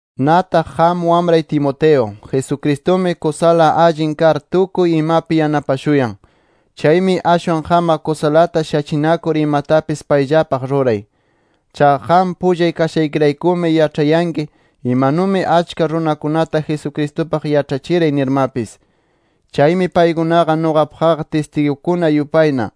Nataq qam wamray Timoteo, Jesucristumi kusala allin kar tukuy imapi yanapashuyan. Chaymi ashwan qamqa kusalata shachinakur imatapis payllapaq ruray. Chaqa qam pullay kashaykiraykumi yaĉhanki, imanumi achka runakunata Jesucristupaq yaĉhachiray nirmapis. Chaymi paykunaqa nuqapaqqa tistigukuna yupayna,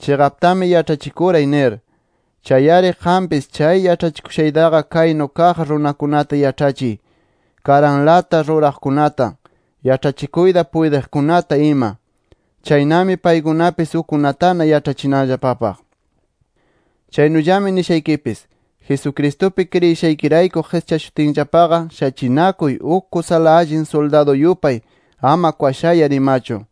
chiqaptami yaĉhachikuray nir. Chay-ari qampis, chay yaĉhachishushaytaqa kaynu kaq runakunata yaĉhachiy: Karanlata ruraqkunata, yaĉhachikuyta puytiqkunata ima. Chaynami paykunapis ukkunatana yaĉhachinanllapapaq. Chaynullami nishaykipis: Jesucristupi kriyishaykirayku qischashutinllapaqa shachinakuy uk kusala allin suldadu yupay, ama kwashayar imachu.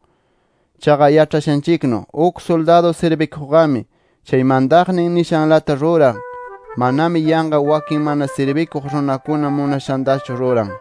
Chaqa yaĉhashanchiknu, uk suldadu sirbikuqqami, chay mantaqnin nishanlata ruran, manami yanqa wakin mana sirbikuq runakuna munashantachu ruran.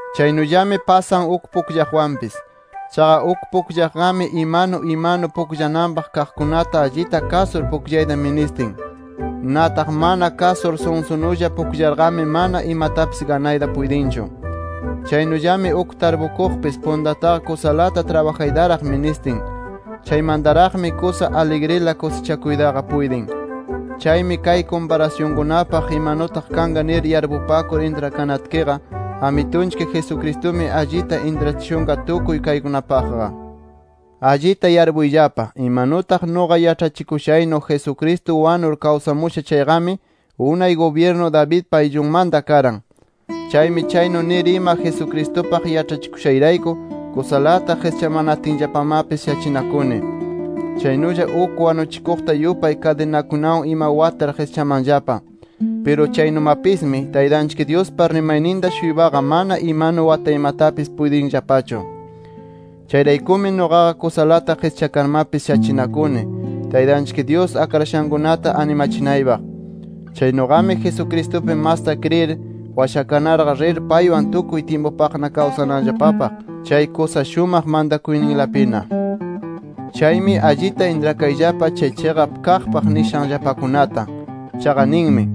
Chaynullami pasan uk pukllaqwanpis. Chaqa uk pukllaqqami imanu imanu pukllananpaq kaqkunata allita kasur pukllayta ministin. Nataq mana kasur sunsunulla pukllarqami, mana imatapis ganayta puytinchu. Chaynullami uk tarpukuqpis puntataqa kusalata trabajaytaraq ministin. Chaymantaraqmi kusa aligrila kusichakuytaqa puytin. Chaymi kay kumparasyunkunapaq imanutaq kanqa nir yarpupakur intrakanatkiqa, Amitunchik Jesucristumi allita intrachishunqa tukuy kaykunapaqqa. Allita yarpuyllapa: Imanutaq nuqa yaĉhachikushaynu Jesucristo wanur kawsamusha chayqami, unay gubyirnu Davidpa ayllunmanta karan. Chaymi chaynu nir ima Jesucristupaq yaĉhachikushayrayku, kusalata qischamatinllapamapis shachinakuni. Chaynulla uk wanuchikuqta yupay kadinakunawan ima watar qischamanllapa. Piru chaynumapismi, Taytanchik Dyuspa rimayninta-shuypaqa mana imanu wataymatapis puytinllapachu. Chayraykumi nuqaqa kusalata qischakarmapis shachinakuni, Taytanchik Dyus akrashankunata animachinaypaq. Chaynuqami Jesucristupi masta kriyir, washakarna rir paywan tukuy tyimpupaqna kawsananllapapaq chay kusa shumaq mantakuyninlapina. Chaymi allita intrakayllapa kay chiqap kaqpaq nishanllapakunata. Chaqa ninmi: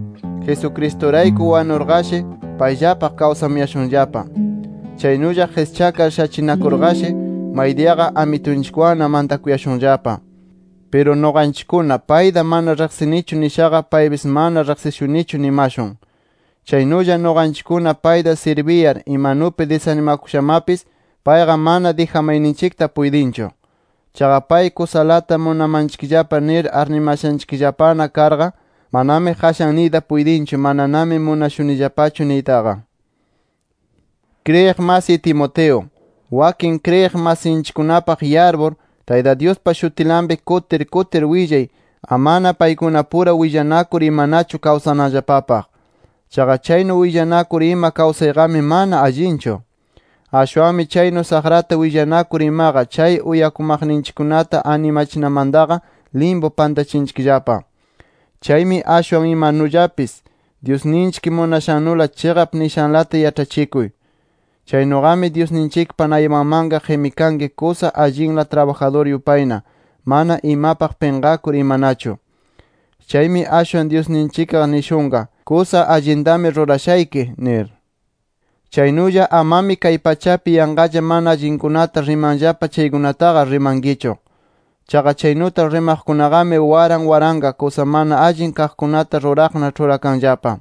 Jesucristurayku wanurqashi, payllapaq kawsamuyashunllapa. Chaynulla qischakar shachinakurqashi, maydiyaqa Amitunchikwanna mantakuyashunllapa. Piru nuqanchikkuna, payta mana riqsinichu nishaqa, paypis mana riqsishunichu nimashun. Chaynulla nuqanchikkuna payta sirbiyar, imanupi disanimakushamapis, payqa mana dijamayninchikta puytinchu. Chaqa pay kusalata munamanchikllapa nir arnimashanchikllapana karqa, manami qashan niyta puytinchu mananami munashunillapachu niytaqa. Kriyiq masiy Timoteo, wakin kriyiq masinchikkunapaq yarpur, Tayta Dyuspa shutinlapi kutir kutir willay amana paykunapura willanakur imanachu kawsananllapapaq. Chaqa chaynu willanakur ima kawsayqami mana allinchu. Ashwanmi chaynu saqrata willanakur imaqa chay uyakumaqninchikkunata animachinamantaqa limpu pantachinchikllapa. Chaymi ashwan imanullapis Dyusninchik munashannula chiqap nishanlata yaĉhachikuy. Chaynuqami Dyusninchikpa naypanmanqa qimikanki kusa allinla trabajadur yupayna, mana imapaq pinqakur imanachu. Chaymi ashwan Dyusninchikqa nishunqa: “Kusa allintami rurashayki” nir. Chaynulla amami kay pachapi yanqalla mana allinkunata rimanllapa chaykunataqa rimankichu. Chaqa chaynuta rimaqkunaqami waran waranqa, kusa mana allin kaqkunata ruraqna ĉhurakanllapa.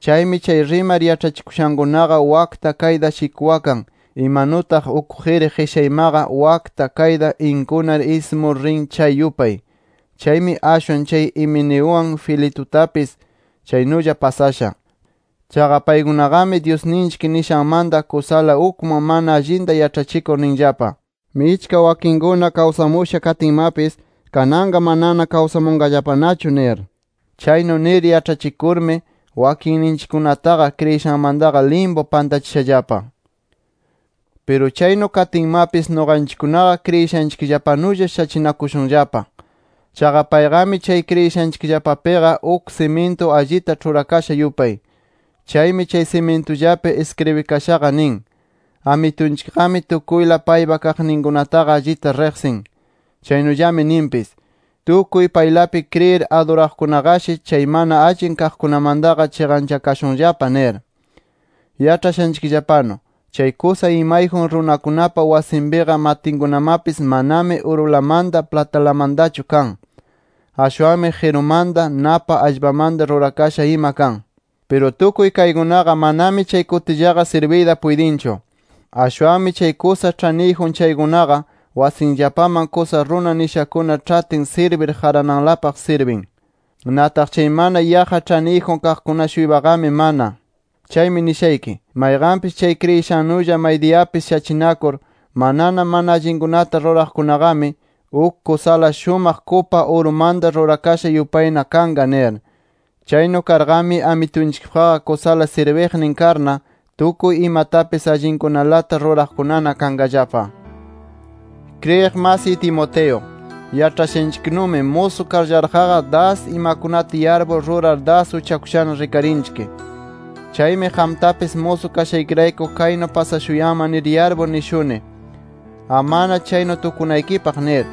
Chaymi chay rimar yaĉhachikushankunaqa wakta kayta shikwakan imanutaq uk qiri qishaymaqa wakta, kayta inkunar ismur rin chay yupay. Chaymi ashwan chay Himeneuwan, Filetutapis chaynulla pasasha. Chaqa paykunaqami Dyusninchik nishanmanta kusala ukman mana allinta yaĉhachikur ninllapa: “Michka wakinkuna kawsamusha katinmapis, kananqa manana kawsamunqallapanachu” nir. Chaynu nir yaĉhachikurmi wakinninchikkunataqa, kriyishanmantaqa limpu pantachishallapa. Piru chaynu katinmapis nuqanchikkunaqa kriyishanchikllapanulla shachinakushunllapa. Chaqa payqami chay kriyishanchikllapapiqa uk simintu allita ĉhurakasha yupay. Chaymi chay simintullapi iskribikashaqa nin: “Amitunchikqami tukuyla paypa kaqninkunataqa allita riqsin” Chaynullami ninpis: “Tukuy paylapi kriyir aduraqkunaqashi, chay mana allin kaqkunamantaqa chiqanchakashunllapa” nir. Yaĉhashanchikllapanu, chay kusa imayjun runakunapa wasinpiqa matinkunamapis manami urulamanta, platalamantachu kan. Ashwanmi qirumanta, napa allpamanta rurakasha ima kan. Piru tukuy kaykunaqa manami chay kutillaqa sirbiyta puytinchu. Ashwanmi chay kusa ĉhaniyjun chaykunaqa, wasinllapaman kusa runa nishakuna ĉhatin sirbir qarananlapaq sirbin. Nataq chay mana yaqqa ĉhaniyjun kaqkuna-shuypaqami mana. Chaymi nishayki: Mayqanpis chay kriyishannulla maydiyapis shachinakur, manana mana allinkunata ruraqkunaqami, uk kusala shumaq kupa urumanta rurakasha yupayna kanqa nir. Chaynu karqami, Amitunchikpaqqa kusala sirbiqnin karna, tukuy imatapis allinkunalata ruraqkunana kanqallapa. Kriyiq masiy Timoteo, yaĉhashanchiknumi musu karllaraqqa das imakunata yarpur rurar das uchakushana rikarinchik. Chaymi qamtapis musu kashaykirayku chaynu pasashuyanman nir yarpur nishuni, amana chaynu tukunaykipaq nir.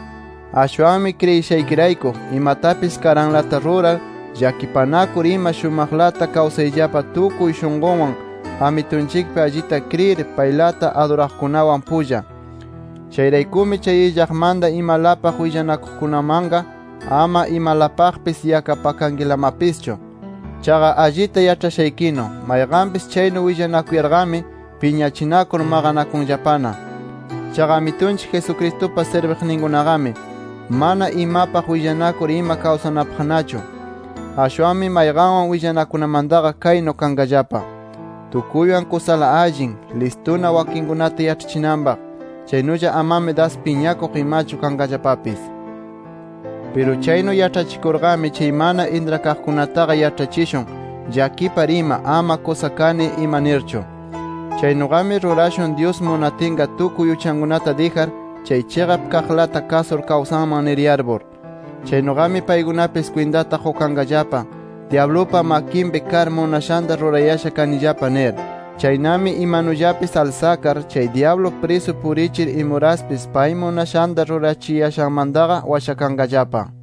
Ashwanmi kriyishaykirayku, imatapis karanlata rurar, llakipanakur ima shumaqlata kawsayllapa tukuy shunqunwan Amitunchikpi allita kriyir paylata aduraqkunawan pulla. Chayraykumi chay illaqmanta imalapaq willanakuqkunamanqa, ama imalapaqpis yakapakankilamapischu. Chaqa allita yaĉhashaykinu, mayqanpis chaynu willanakuyarqami, piñachinakur maqanakunllapana. Chaqa Amitunchik Jesucristupa sirbiqninkunaqami, mana imapaq willanakur ima kawsananpaqnachu. Ashwanmi mayqanwan willanakunamantaqa kaynu kanqallapa: Tukuywan kusala allin, listuna wakinkunata yaĉhachinanpaq, chaynulla amami das piñakuq imachu kanqallapapis. Piru chaynu yaĉhachikurqami chay mana intrakaqkunataqa yaĉhachishun llakipar ima, ama kusa kani ima nirchu. Chaynuqami rurashun Dyus munatinqa tukuy uchankunata dijar chay chiqap kaqlata kasur kawsanman nir yarpur. Chaynuqami paykunapis kwintata qukanqallapa: Dyablupa makinpi kar munashanta rurayasha kanillapa nir. Chaynami imanullapis alsakar chay dyablu prisu purichir imuraspis pay munashanta rurachiyashanmantaqa washakanqallapa.